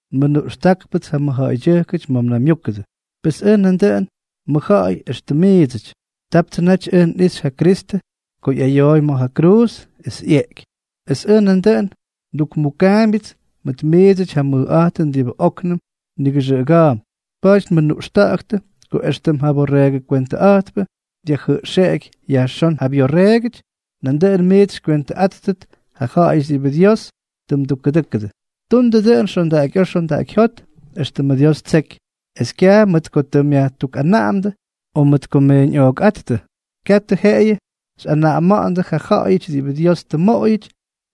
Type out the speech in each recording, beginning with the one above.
Nmʉnuꞌxtáktʉpts ja mʉjja̱ꞌa̱ydyʉjkʉty ma̱ mnaymyúkʉdʉ. Pes ʉj nandʉꞌʉn mʉjja̱ꞌa̱y éxtʉm miidsʉty. Taptsʉ naty ʉj nꞌixy ja Kristʉ ko ꞌyayooy ma̱ ja kruuz es ꞌyeꞌky, es ʉj nandʉꞌʉn ndukmukaambyʉts mʉt miidsʉty ja mʉjꞌa̱jtʉn diꞌibʉ óknʉm nigʉxʉꞌʉga̱a̱mp. Pa̱a̱ty nmʉnuꞌxta̱ꞌa̱ktʉ, ko éxtʉm ja borreegʉ kwentʉꞌa̱jtpʉ dyajjʉꞌxeꞌeky yajxón ja byorreegʉty, nandʉꞌʉn miits xykywentʉꞌáttʉt yʉ ja̱ꞌa̱yʉty diꞌibʉ Dios tʉ mdukkʉdʉ́kʉdʉ. Tundʉ dʉꞌʉn xondaꞌakyꞌa̱a̱ xondaꞌakyjyót, éxtʉmʉ Dios ttseky, es kyaj mʉt ko tʉ myajtukꞌanaꞌamdʉ o mʉt ko mmeeñꞌookꞌáttʉ. Katʉ jeꞌeyʉ xyꞌanaꞌama̱ꞌa̱ndʉ ja ja̱ꞌa̱yʉty diꞌibʉ Dios tʉ mmoꞌoyʉty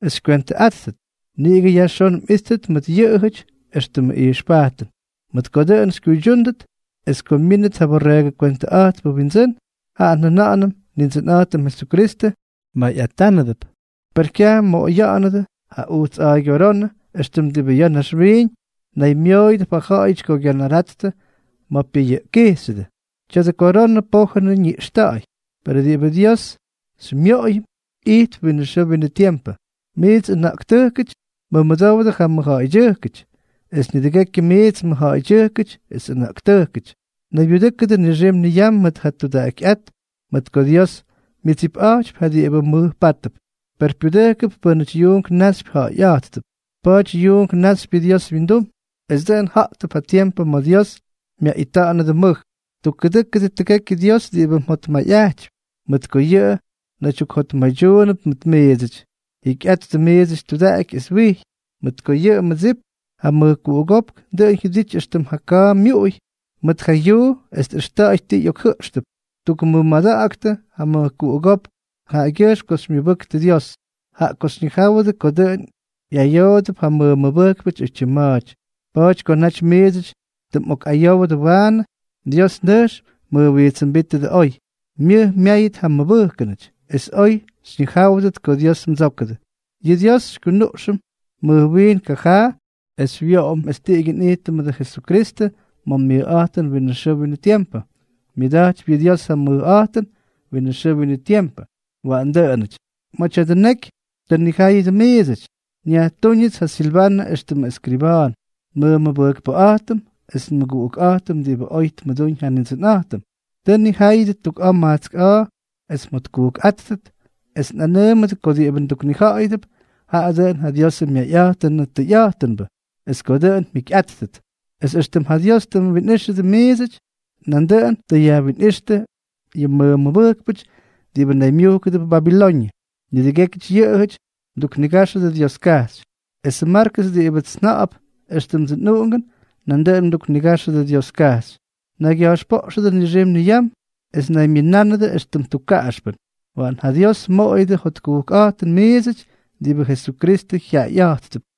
es xykywentʉꞌáttʉt, niꞌigʉ yajxón mꞌíttʉt mʉt yʉꞌʉjʉty éxtʉmʉ ijxpajtʉn. Mʉt ko dʉꞌʉn xykyuydyúndʉt, es ko myínʉt ja Borreegʉ Kwentʉꞌa̱jtpʉ Wyindsʉ́n, jaꞌa njʉna̱ꞌa̱nʉm Nindsʉnꞌa̱jtʉm Jesukristʉ, mmayꞌatánʉdʉp. Per kyaj mmoꞌoya̱ꞌa̱nʉdʉ ja ujts a̱a̱ygyorónʉ éxtʉm diꞌibʉ ya̱ naxwiiñ naymyooyʉdʉp ja ja̱ꞌa̱yʉty ko gyanarattʉ ma̱ pyʉyʉꞌkkijxyʉdʉ. Tya̱dʉ koronʉ pójʉnʉ ñiꞌxta̱ꞌa̱y. Perʉ diꞌibʉ Dios xymyoꞌoyʉm, ijtp winʉ xʉʉ winʉ tiempʉ. Miits ʉna̱ꞌktʉjkʉty, mʉmʉdowdʉ ja mʉjja̱ꞌa̱ydyʉjkʉty; es nidʉgekyʉ miits mʉjja̱ꞌa̱ydyʉjkʉty es ʉna̱ꞌktʉjkʉty, naybyudʉ́kʉdʉ nixim niyam mʉt ja tudaꞌakyꞌát, mʉt ko Dios myʉdsipꞌa̱jtypy ja diꞌibʉ mʉjpátʉp, per pyudʉjkʉp pʉ́nʉty yuunk naxypy ja̱ꞌa̱yꞌa̱jttʉp. Pa̱a̱ty yuunk náxypyʉdʉ Dios wyindum, es dʉꞌʉn ja̱ꞌtʉp ja tiempʉ ma̱ Dios myaꞌita̱ꞌa̱nʉdʉ mʉj. Tukkʉdʉkʉ tʉgekyʉ Dios diꞌibʉ mjotmayꞌajtypy, mʉt ko yʉꞌʉ naydyukjotmaydyuunʉp mʉt miidsʉty. Jikyꞌattʉ miits tudaꞌaky es wijy, mʉt ko yʉ mmʉdsip, ja mʉjkuꞌugópk, dʉꞌʉn jyʉdity éxtʉm ja ka̱a̱ myuꞌuy mʉt ja yuu es tꞌʉxta̱ꞌa̱y ti ꞌyokjʉꞌxʉp. Tukmʉmada̱ꞌa̱ktʉ ja mʉjkuꞌugópk jaꞌagyʉjxm ko xymyʉbʉktʉ Dios, jaꞌa ko xyñijáwʉdʉ ko dʉꞌʉn ꞌyayoodʉp ja mmʉmʉbʉjkpʉty oytyim ma̱a̱ty. Pa̱a̱ty ko naty miidsʉty tʉ mꞌokꞌayowdʉ waanʉ, Dios nʉjx mjʉjwijtsʉmbítʉdʉ oy, myʉj myáyʉt ja mmʉbʉjkʉnʉty, es oy xyñijáwʉdʉt ko Dios mdsókʉdʉ. Yʉ Dios xykyunuꞌxʉm mʉj wiin kajaa, es xywyoꞌom es tiꞌigyʉ nꞌijtʉm mʉdʉ Jesukristʉ ma̱ myʉjꞌa̱jtʉn winʉ xʉʉ winʉ tiempʉ. Myʉda̱jtypy yʉ Dios ja mʉjꞌa̱jtʉn winʉ xʉʉ winʉ tiempʉ. Waꞌan dʉꞌʉnʉty. Ma̱ tya̱dʉ neky tʉ nnijáyʉdʉ miidsʉty, nyajtúñʉts ja Silvanʉ éxtʉmʉ ʉskriba̱a̱n, nmʉmʉbʉjkpʉꞌa̱jtʉm es nmʉguꞌukꞌa̱jtʉm diꞌibʉ oy tmʉdúñ ja Nindsʉnꞌa̱jtʉm. Tʉ nnijáyʉdʉ tuk a̱a̱ majtsk a̱a̱ es mjotkujkꞌáttʉt, es nꞌanʉʉmʉdʉ ko diꞌibʉ nduknija̱ꞌa̱yʉdʉp, jaꞌa dʉꞌʉn ja Diosʉ myayꞌa̱jtʉnʉ tʉyꞌa̱jtʉnbʉ, es ko dʉꞌʉn mjikyꞌáttʉt. Es éxtʉm ja Dios tʉ mwinꞌíxʉdʉ miidsʉty, nandʉꞌʉn tʉ yajwinꞌíxtʉ yʉ mmʉmʉbʉjkpʉty diꞌibʉ naymyujkʉdʉp Babiloñʉ. Nidʉgékyʉty yʉꞌʉjʉty mduknigáxʉdʉ Dioskajxy. Esʉ Markʉs diꞌibʉts nja̱ꞌa̱p éxtʉmdsʉ nꞌuꞌungʉn, nandʉꞌʉn mduknigáxʉdʉ Dioskajxy. Naygya̱jxpoꞌxʉdʉ nixim niyam es naymyʉnánʉdʉ éxtʉm tukkaꞌaxpʉn. Waꞌan ja Dios mmoꞌoyʉdʉ jotkujkꞌa̱jtʉn miidsʉty diꞌibʉ Jesukristʉ jyaꞌayꞌa̱jttʉp.